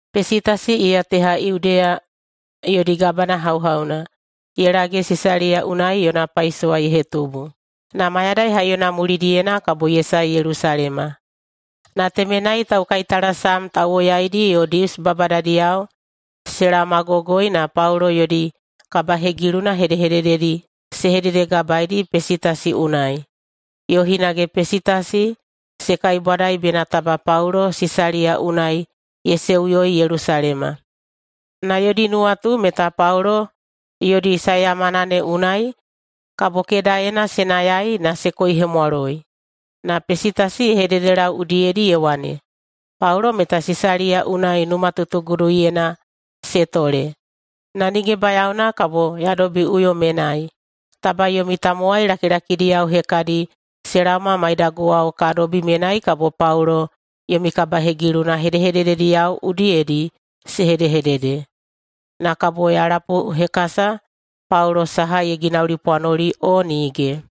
Pesitasi iya teha Yudeya yodi gabana hauhauna ye lage Sisaliya unai yona paisowa ye hetubu, na mayadai haiyona mulidiyena kabo ye sae Yelusalema. Na temenai taukaitalasam tauwoyaidi yo Dius babadadiyao se laomagogoi na Paulo yodi kabahegiluna hedehedededi se hededegabaeidi Pesitasi unai, yo hinage Pesitasi se kaibwadai bena taba Paulo Sisaliya unai se seuyoi Yelusalema. Na yodi nuwatu meta Paulo yodi saeyamana ne unai kabo kedaena se nayai na se koihemwaloi. Na Pesitasi ye hededelau udiyedi ye wane, “Paulo meta Sisaliya unai numatutuguduyena se tole, na nige bayaona kabo ya dobiꞌuyo menai. Taba yomi tamowai lakilakidiyao hekadi se laoma maidaguwao ka dobi menai kabo Paulo yomi kabahegiluna hedehededediyao udiyedi se hedehedede, na kabo ya lapuhekasa Paulo saha ye ginaulipwanoli o nige.”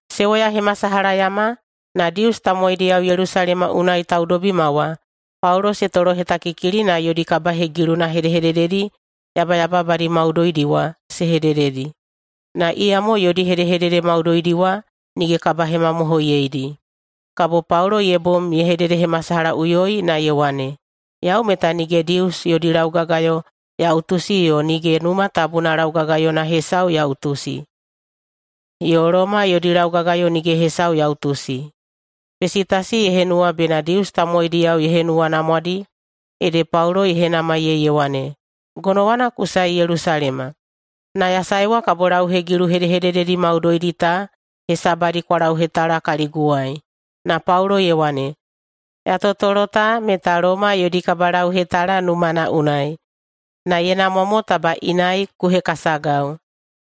Se woyahemasalahayama, na Dius tamowaidiyao Yelusalema unai taudobima wa Paulo se tolohetakikili na yodi kabahegiluna hedehedededi yabayababadi maudoidi wa se hedededi. Na iyamo yodi hedehedede maudoidi wa nige kabahemamohoiyeidi. Kabo Paulo ye bom ye hededehemasalahaꞌuyoi na ye wane, “Yau meta nige Dius yodi laugagayo ya utusi yo nige Numa Tabuna laugagayona hesau ya utusi, yo Loma yodi laugagayo nige hesau ya utusi.” Pesitasi ye henuwa bena Dius tamowaidiyao ye henuwanamwadi ede Paulo ye henamaiyei ye wane, “Gonowana ku sae Yelusalema? Na ya saewa kabo lauhegilu hedehedededi maudoidi ta hesabadi kwa lauhetala kaliguwai.” Na Paulo ye wane, “Ya totolo ta meta Loma yodi kabalauhetala numana unai, na ye namwa mo taba inai ku hekasagau.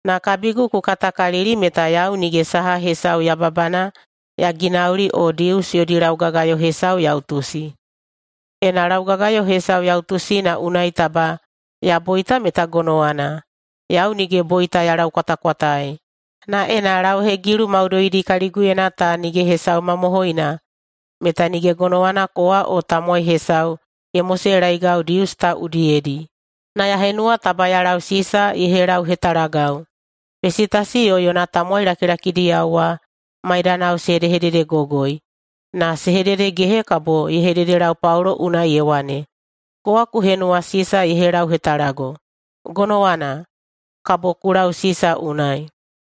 Na kabigu ku katakalili meta yau nige saha hesau yababana ya ginauli o Dius yodi laugagayo hesau ya utusi. Ena laugagayo hesau ya utusi na unai taba ya boita meta gonowana, yau nige boita ya laukwatakwataei. Na ena lauhegilu maudoidi kaliguyena ta nige hesau mamohoina meta nige gonowana kowa o tamowai hesau ye moselaeigau Dius ta udiyedi. Na ya henuwa taba ya lau Sisa ye helauhetalagau.” Pesitasi yo yona tamowai lakilakidiyao wa maidanao se hedehededegogoi, na se hededegehe kabo ye hededelau Paulo unai ye wane, “Kowa ku henuwa Sisa ye helauhetalago. Gonowana! Kabo ku lau Sisa unai.”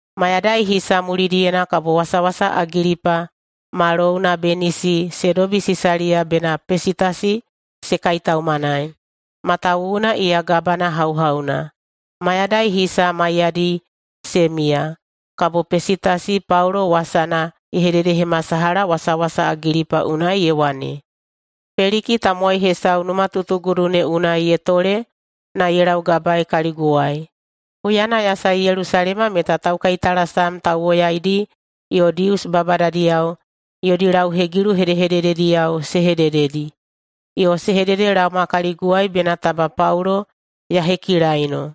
Mayadai hisa mulidiyena kabo wasawasa Agilipa ma louna Benisi se dobi Sisaliya bena Pesitasi se kaitaumanai, matawuwuna iya gabana hauhauna. Mayadai hisa maiyadi se miya, kabo Pesitasi Paulo wasana ye hededehemasalaha wasawasa Agilipa unai ye wane, “Peliki tamowai hesau numatutugudu ne unai ye tole na ye laugabaei kaliguwai. Huyana ya sae Yelusalema meta taukaitalasam tauwoyaidi yo Dius babadadiyao yodi lauhegilu hedehededediyao se hedededi, yo se hededelaoma kaliguwai bena taba Paulo ya hekilaino.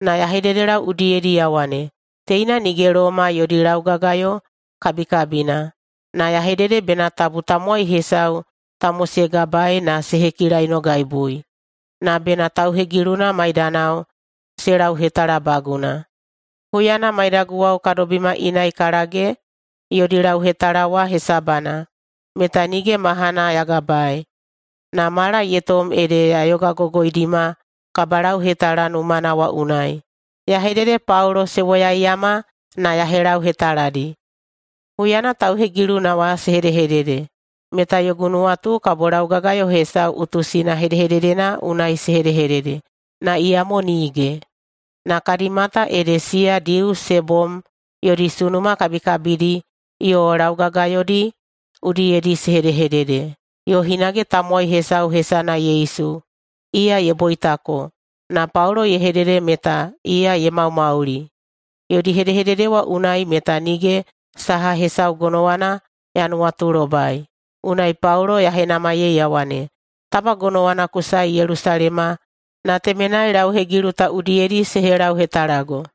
Na ya hededelau udiyedi ya wane, ‘Teina nige Loma yodi laugagayo kabikabina.’ Na ya hedede bena tabu tamowai hesau ta mosegabaei na se hekilainogaibui, na bena tauhegiluna maidanao se lauhetalabaguna. Huyana maidaguwao ka dobima inai ka lage yodi lauhetala wa hesabana, meta nige mahana ya gabaei, na mala ye tom ede ya yogagogoidima kabalauhetala numana wa unai, ya hedede Paulo se woyaiyama na ya helauhetaladi. Huyana tauhegiluna wa se hedehedede, meta yogu nuwatu kabo laugagayo hesau utusina hedehededena unai se hedehedede, na iyamo nige. Na kadi mata ede siya Dius se bom yodi sunuma kabikabidi yo laugagayodi udiyedi se hedehedede, yo hinage tamowai hesau hesana Yesu, iya ye boitako, na Paulo ye hedede meta iya ye maumauli. Yodi hedehedede wa unai meta nige saha hesau gonowana ya nuwatulobai. Unai Paulo ya henamaiyei ya wane, ‘Taba gonowana ku sae Yelusalema na temenai lauhegilu ta udiyedi se helauhetalago?’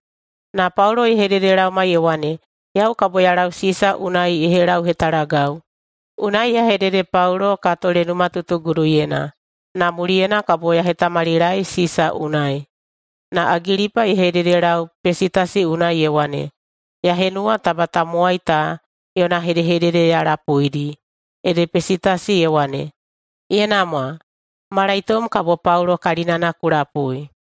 Na Paulo ye hededelaoma ye wane, ‘Yau kabo ya lau Sisa unai ye helauhetalagau!’ Unai ya hedede Paulo ka tole numatutuguduyena, na muliyena kabo ya hetamalilaei Sisa unai.” Na Agilipa ye hededelau Pesitasi unai ye wane, “Ya henuwa taba tamowai ta yona hedehedede ya lapuidi.” Ede Pesitasi ye wane, “Ye namwa, malaitom kabo Paulo kalinana ku lapui.”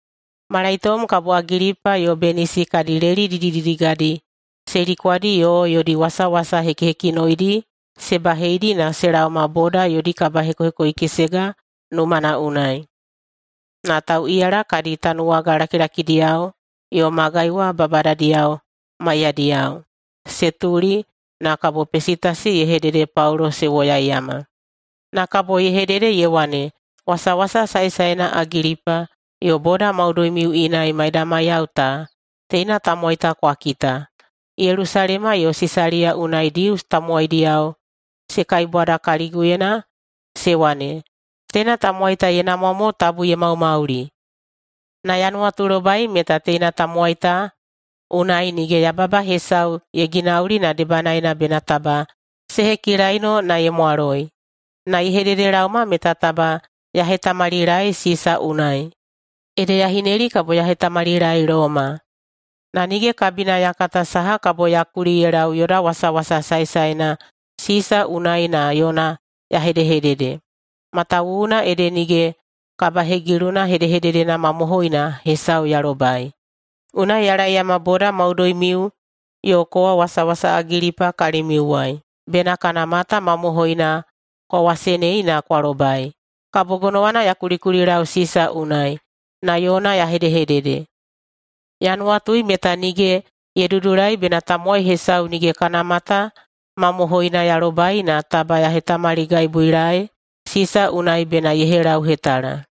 Malaitom kabo Agilipa yo Benisi kadi leli didididigadi se likwadi yo yodi wasawasa hekihekinoidi se baheidi na se laoma boda yodi kabahekohekoikesega numana unai, na tauꞌiyala kadi tanuwaga lakilakidiyao yo magai wa babadadiyao maiyadiyao. Se tuli, na kabo Pesitasi ye hedede Paulo se woyaiyama. Na kabo ye hedede ye wane, “Wasawasa saesaena Agilipa yo boda maudoimiu inai maidamaiyao ta, teina tamowai ta kwa kita! Yelusalema yo Sisaliya unai Dius tamowaidiyao se kaibwada kaliguyena se wane, ‘Teina tamowai ta ye namwa mo tabu ye maumauli.’ Na ya nuwatulobai meta teina tamowai ta unai nige yababa hesau ye ginauli na debanaena bena taba se hekilaino na ye mwaloi. Na ye hededelaoma meta taba ya hetamalilaei Sisa unai. Ede ya hineli kabo ya hetamalilaei Loma. Na nige kabina ya kata saha kabo ya kuli ye lau yoda wasawasa saesaena Sisa unai na yona ya hedehedede, matawuwuna ede nige kabahegiluna hedehededena mamohoina hesau ya lobai. Unai ya laeyama boda maudoimiu yo kowa wasawasa Agilipa kalimiuwai, bena kana mata mamohoina kwa wasenei na kwa lobai, kabo gonowana ya kulikulilau Sisa unai, na yona ya hedehedede. Ya nuwatui meta nige ye dudulai bena tamowai hesau nige kana mata mamohoina ya lobai na taba ya hetamaligaibuilaei Sisa unai bena ye helauhetala.”